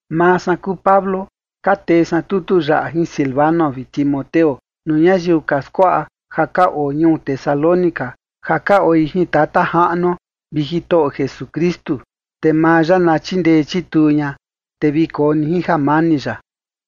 Maa san kuu Pablo ka tee san tutu yaꞌa jin Silvano vi Timoteo, nuu ñayiu ka skuaꞌa ja ka oo ñuu Tesalónica ja ka oi jin Tata Jaꞌnuo vi Jitoꞌo Jesukristu. Te maa ya na chindee chituu ña, te vi koo ni jin jamani ya.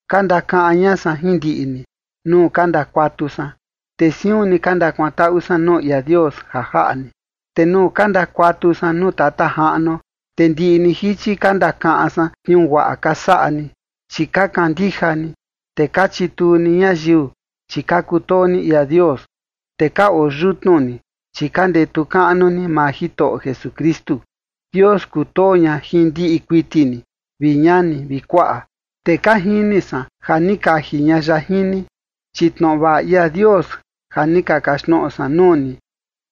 Ka ndakaꞌan ña san jin ndiꞌi ni nuu ka ndakuatu san, te siun ni ka ndakuantaꞌu san nuu ia Dios ja jaꞌa ni. Te nuu ka ndakuatu san nuu Tata Jaꞌnuo, te ndiꞌi ni jichi ka ndakaꞌan san tniuu guaꞌa ka saꞌa ni, chi ka kandija ni, te ka chituu ni ñayiu, chi ka kutoo ni ia Dios, te ka oo yutnu ni, chi ka ndetu kaꞌnu ni maa Jitoꞌo Jesukristu. Dios kutoo ña jin ndiꞌi kuiti ni, vi ñani vi kuaꞌa, te ka jini san ja ni kaji ña ya jin ni. Chi tnoꞌo vaꞌa ia Dios ja ni ka kaxtnoꞌo san nuu ni,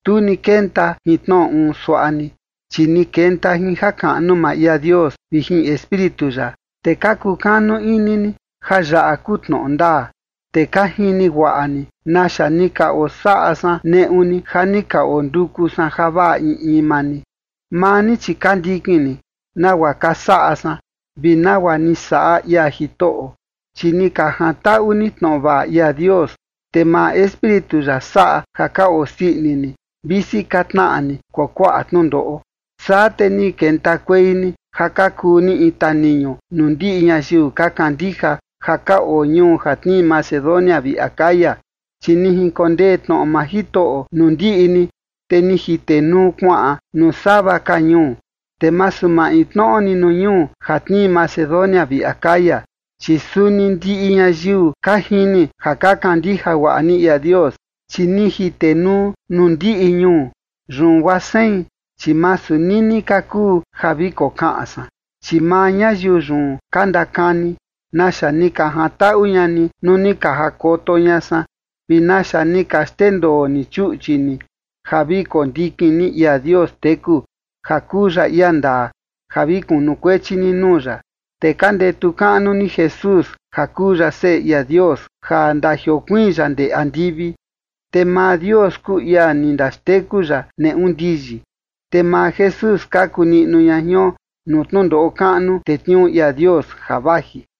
tu ni kenta jin tnoꞌo uun suaꞌa ni, chi ni kenta jin jakaꞌnu maa ia Dios vi jin Espíritu ya, te ka kukanu ini ni ja yaꞌa kuu tnoꞌo ndaa. Te ka jini guaꞌa ni naxa ni ka osaꞌa san neꞌu ni ja ni ka onduku san javaꞌa in in maa ni. Maa ni, chi ka ndikin ni nagua ka saꞌa san vi nagua ni saꞌa ia Jitoꞌo, chi ni ka jantaꞌu ni tnoꞌo vaꞌa ia Dios, te maa Espíritu ya saꞌa ja ka osii ini ni, visi ka tnaꞌa ni kuakuaꞌa tnundoꞌo. Saa te ni kentakuei ni ja ka kuu ni in taniñu nuu ndiꞌi ñayiu ka kandija ja ka oo ñuu ja tnii Macedonia vi Acaya. Chi ni jinkondee tnoꞌo maa Jitoꞌo nuu ndiꞌi ni, te ni jitenuu kuaꞌan nuu sava ka ñuu, te masu maintnoꞌo ni nuu ñuu ja tnii Macedonia vi Acaya, chi suni ndiꞌi ñayiu ka jini ja ka kandija guaꞌa ni ia Dios. Chi ni jitenuu nuu ndiꞌi ñuu, yun guaa sein, chi masu nini ka kuu ja vi kokaꞌan san. Chi maa ñayiu yun ka ndakani naxa ni ka jantaꞌu ña ni nuu ni ka jakoto ña san vi naxa ni ka xndendoo ni chuꞌchi ni ja vi kondikin ni ia Dios teku ja kuu ya ia ndaa ja vi kunukuechi ni nuu ya, te ka ndetu kaꞌnu ni Jesús ja kuu ya Seꞌe ia Dios ja ndajiokuiin ya ndee andivi. Te maa Dios kuu ia ni ndaxteku ya neꞌu ndiyi, te maa Jesús skaku niꞌnu ña jion nuu tnundoꞌo kaꞌnu tetniuu ia Dios ja vaji.